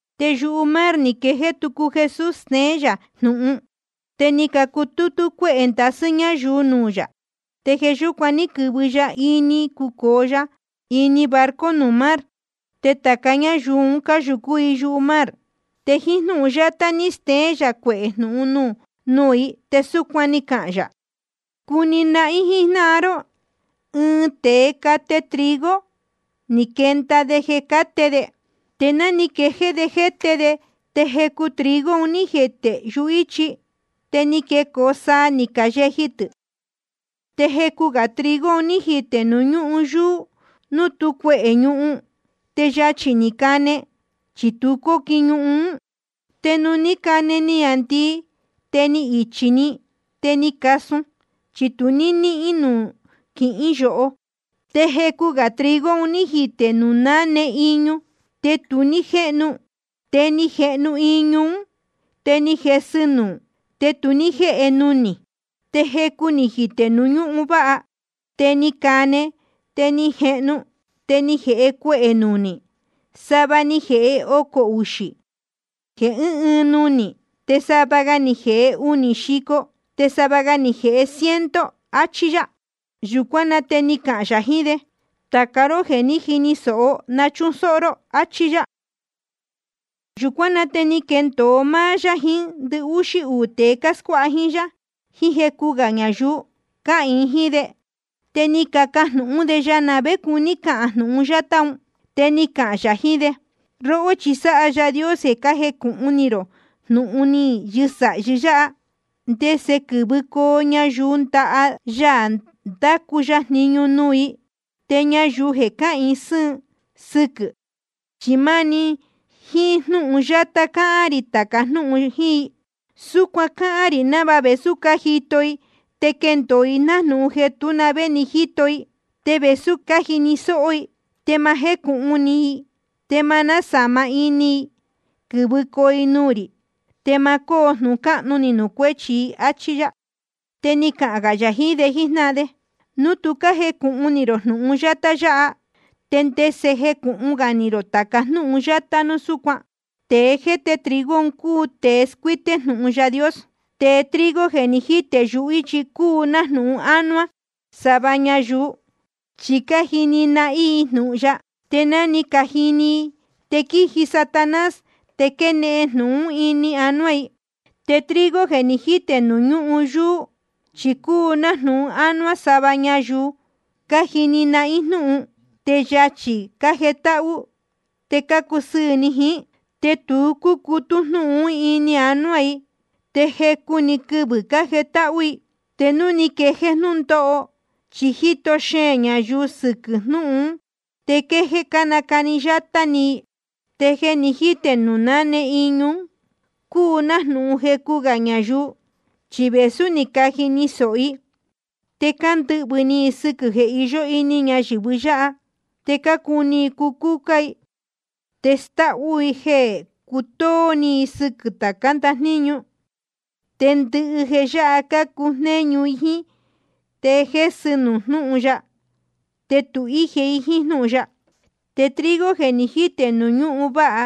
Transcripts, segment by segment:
Te yumar ni quejéé tucu Jesús steén yā jnūhun. Te ni cutútú cuéhē ndasɨ́ ñáyuu nuū yā, te jeē yúcuan ní quɨ̄vɨ ya ni cucōo ya ini ɨɨn barco nuū mar. Te tāca ñáyuu un cáyūcú i yumar. Te jíín jnúhun yátá ni steén yā cuehē jnūhun nuū i, te súcuan ni cahān yā: Cuni nahín jíjnáhan ró: ɨɨn tēe cate trigo, ni quenda de jeē cáte de. Te ná ni quejéé de jéte de, te jecu trigo ni jitē yuhíchi. Te ni quecoo saa, ni cayeji tɨ̄. Te jecu gā trigo ni jitē nuū ñúhun yuū, nuū tú cuehē ñuhun. Te yachī‑ni ni cane, chi tu cóquin ñuhun. Te nuū ní cane niāndii, te ni ichī‑ni, te ni casun, chi tu ní níhín nuū quihín yoho. Te jecu gā trigo ni jitē nuū náne iñu. Te ni jehnu iñu ún, te ni jesɨ nuū, te tu ní jéhe nunī. Te jecu ni jitē nuū ñúhun váha. Te ni cane, te ni jehnu, te ni jēhe cuehē nunī. Sava ni jēhe ocō uxī jeē ɨ́ɨn ɨɨn nunī, te sava ga ni jēhe unī xico, te sava ga ni jēhe ciento. Achí yá. Yūcuán na te ni cahān yā jiín de: Tāca róhó jéē jíni sōho, na chúsóhó ró. Achí yá. Yūcuán na te ni quendōo máá na yā, jiín ndɨhúxí uū tēe cáscuáha jíín yá, jiín jecu gā ñayuu cáhīin jíín de. Te ni cacajnūhún de ya na vé cuní cahān jnūhun yátá un. Te ni cahān yā jiín de: Róhó, chi sáha Yaā Dios jeē cájecūhun ni rō jnūhun ni yɨsāhi yáha, ndese quɨ́vɨcoo ñayuu ndaha ya ndacu ya jniñu nuū i. Te ñayuu jeē cáhīin sɨ́ɨn sɨquɨ̄, chi máni jíín jnúhun yátá cáhán rī tāca jnúhun jíín i. Súcuan cáhán rī návāha vēsú cájito i, te quendōo i nájnūhun jeē tú na vé ni cájito i. Te vēsú cájini sōho i, te ma jécūhun ni i, te ma násāma ini i quɨ̄vɨcoo i nuū rī, te ma cóo jnūhun cáhnu ni nuū cuéchi i, áchí yá. Te ni cahān gā yā jiín de jíjnáhan de: Núu tu cájecūhun ni rō jnūhun yátá yáha, ¿te ndese jecūhun ni rō tāca gá jnūhun yátá núu súcuan? Tēe jéte trigo cúu tēe scuíté núu jnūhun Yaā Dios. Te trigo jeē ni jítē yuhíchi cúu nájnūhun ánuá sava ñayuu. Chi cájini nahín i jnūhun ya, te ná ni cajini i, te quíji‑ni Satanás te quénde‑ni jnūhun ini anuá i. Te trigo jeē ni jítē nuū ñúhun yuū, chi cúu nájnūhun ánuá sava ñayuu cájini nahín jnúhun, te yachī‑ni cájetáhú i te cácusɨɨ̄ ni i jíín. Te tu cúcutú jnúhun ún ini anuá i, te jecu‑ni quɨvɨ̄ cájetáhú i. Te núu ni quejéé jnúndóho, chí jíto xeēn ñayuu i sɨquɨ̄ jnúhun ún, te quéjéé nácani yátá ni i. Te jeē ni jítē nuū náne iñu cúu nájnūhun jecu gā ñayuu. Chi vēsú ni cajini sōho i, te cándɨhvɨ̄ ni i sɨquɨ̄ jeē iyó ini ñayɨ̄vɨ yáha. Te cácuni i cucúcá i, te stáhú un i jeē cutóó ni i sɨquɨ̄ tācá ndajníñu. Te ndɨhɨ jeē yáha cácujnéñu i jíín, te jésɨ nuū jnúhun ya, te tu íje i jíín jnúhun ya. Te trigo jeē ni jítē nuū ñúhun váha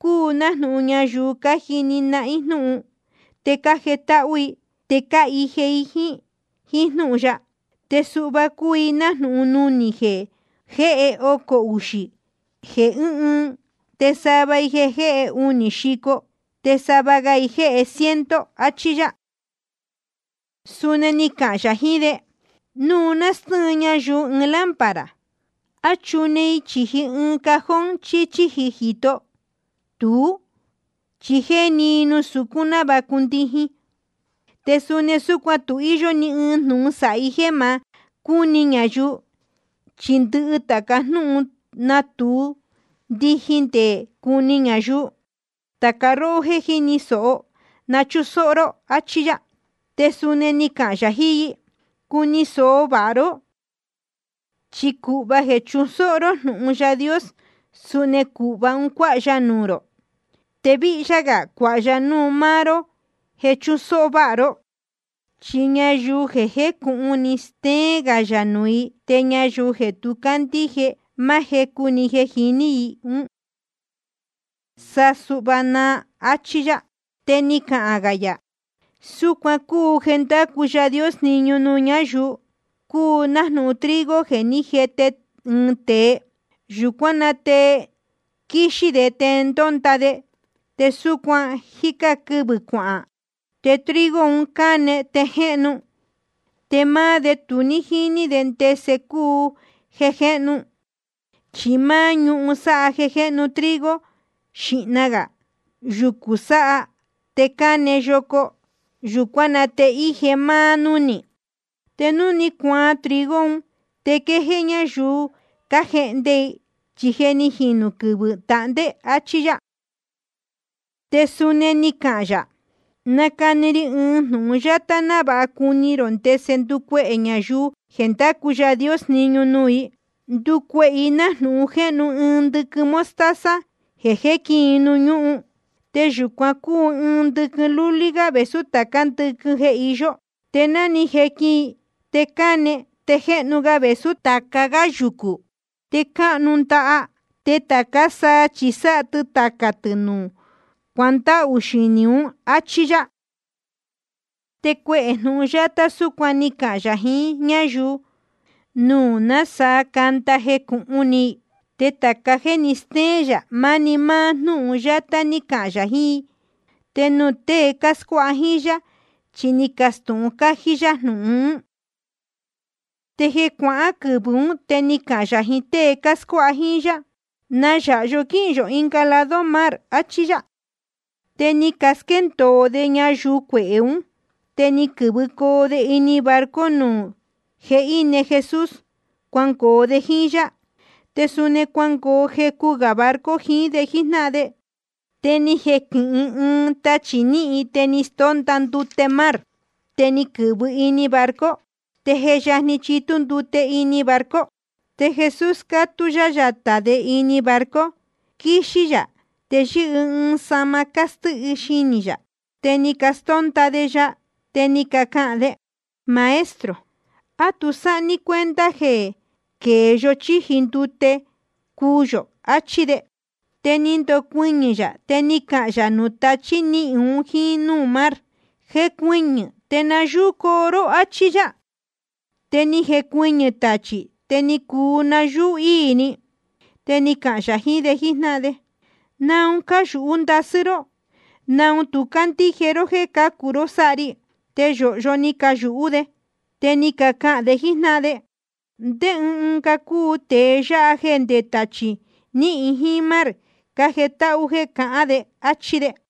cúu nájnūhun ñayuu cájini nahín jnúhun, te cájetáhú i, te cáhije i jíín jnúhun ya. Te sava i cúu nájnūhun nunī jeē jéhe ocō uxī jeē ɨ́ɨn ɨɨn, te sava i jéhe unī xico, te sava ga i jéhe ciento. Achí yá. Suni ni cahān yā jiín de: Núu nástɨ́ɨn ñayuu ɨɨn lámpara, ¿a chúne i chīji ɨɨn cajón chí chíji jīto? Tuú, chi jéni i nuū sucún návāha cundijin. Te suni súcuan, tu íyó ni ɨɨn jnūhun sāhi jéē ma cúni ñayuu, chi ndɨhɨ tāca jnúhun natūu ndijin te cuni ñayuu. Tāca róhó jéē jíni sōho, na chúsóhó ró, áchí yá. Te suni ni cahān yā jiín i: Cuni sōho vāha ró. Chi cūhva jeē chusóhó ró jnúhun Yaā Dios, suni cūhva un cuáha ya nuū rō, te víhyá gā cuāha ya nuū maá ró jeē chusóhó váha ró. Chi ñayuu je jécūhun ni, stéén gā yā nuū i. Te ñayuu tu cándíje, máá jecu jeē jiní i ún, sa suhva naa. Achí yá. Te ni cahān gā yā: Súcuan cúu jeē ndácu Yaā Dios jniñu nuū ñáyuu: Cúu nájnūhun trigo jeē ní jete ɨɨn tēe. Yūcuán na te quíxí de te ndónda de, te súcuan jíca quɨvɨ̄ cuahān. Te trigo un cáne te jéhnu. Te máá de tu jíní de ndese cúu jeē jéhnu. Chi máá ñuhun sáha jeē jéhnu trigo, xīhna gā yucū, sáá te cáne yoco, yūcuán na te íje máá núnī. Te núu ni cuaan trigo un, te quéjéé ñáyuu cájehnde i, chi je ni jinū quɨvɨ̄ tahndé. Achí yá. Te suni ni cahān yā: Na cáhán rī ɨɨn jnūhun yátá návāha cuni rō ndese ndúcuehē ñayuu jeē ndácu Yaā Dios jniñu nuū. Ndúcuehē i nájnūhun jéhnu ɨɨn ndɨquɨn mostaza jeē jéquin i nuū ñúhun. Te yūcuan cúu ɨɨn ndɨquɨn lúlí gá vēsú tācá ndɨquɨn jeē iyó. Te ná ni jequin i, te cáne te jéhnu ga vēsú tāca gá yucū, te cúnáhnu ndaha. Te tācá saa chi sáha tɨ tacā tɨ̄ nuū cuándahū xinī ún. Achí yá. Te cuehē jnūhun yátá súcuan ni cahān yā jiín ñáyuu, núu nasaa cánda i jecūhun ni i. Te tāca jéē ni stéén yā, máni máá jnúhun yátá ní cahān yā jiín i. Te nuū tēe cáscuáha jíín yá chi ni nacastūhun cájí yá jnūhun ún. Te jeē cuácuaa quɨvɨ̄ ún, te ni cahān yā jiín tée cáscuáha jíín yá: Na yáha yó quíhīn yō ɨnga lado mar, achí yá. Te ni casquéndōo de ñayuu cuehē ún, te ni quɨ̄vɨcoo de ini barco nuū je íne Jesús, cuangoo de jíín yá. Te suni cuangoo jecu gā barco jiín de jíjnáhan de. Te ni jequɨ̄hɨ ɨɨn tachī níhin, te ni stónda ndute mar, te ni quɨ̄vɨ ini barco. Te je yajni chitú ndute ini barco. Te Jesús cátú yá yatā de ini barco, quíxí yā te yɨ́hɨ ɨɨn sahma cástíhi xinī yā. Te ni castónda de ya, te ni cacahān de: Maestro, ¿á tu sáha ní cuenta jeē quēe yó chíji ndute te cuu yō? achí de. Te ni ndocuɨñɨ̄ yā, te ni cahān yā nuū tachí níhin un jíín núū mar: Jecuɨñɨ̄ te nayúú‑ni coo ró, áchí yá. Te ni jecuɨñɨ̄ tachī, te ni cuu nayúú íī‑ni. Te ni cahān yā jiín de jíjnáhan de: ¿Naun cáyūhú ndasɨ́ ró? ¿Naun tu cácandíje ró jéē cācu ró sáha ri? Te yōhyo ni cayūhú de, te ni cacahān de jíín jnáhan de: ¿Ndé ɨɨn ga cúu tēe yáha jéē nde tachī níhin jíín mar cájetáhú jéē cahán de? áchí de.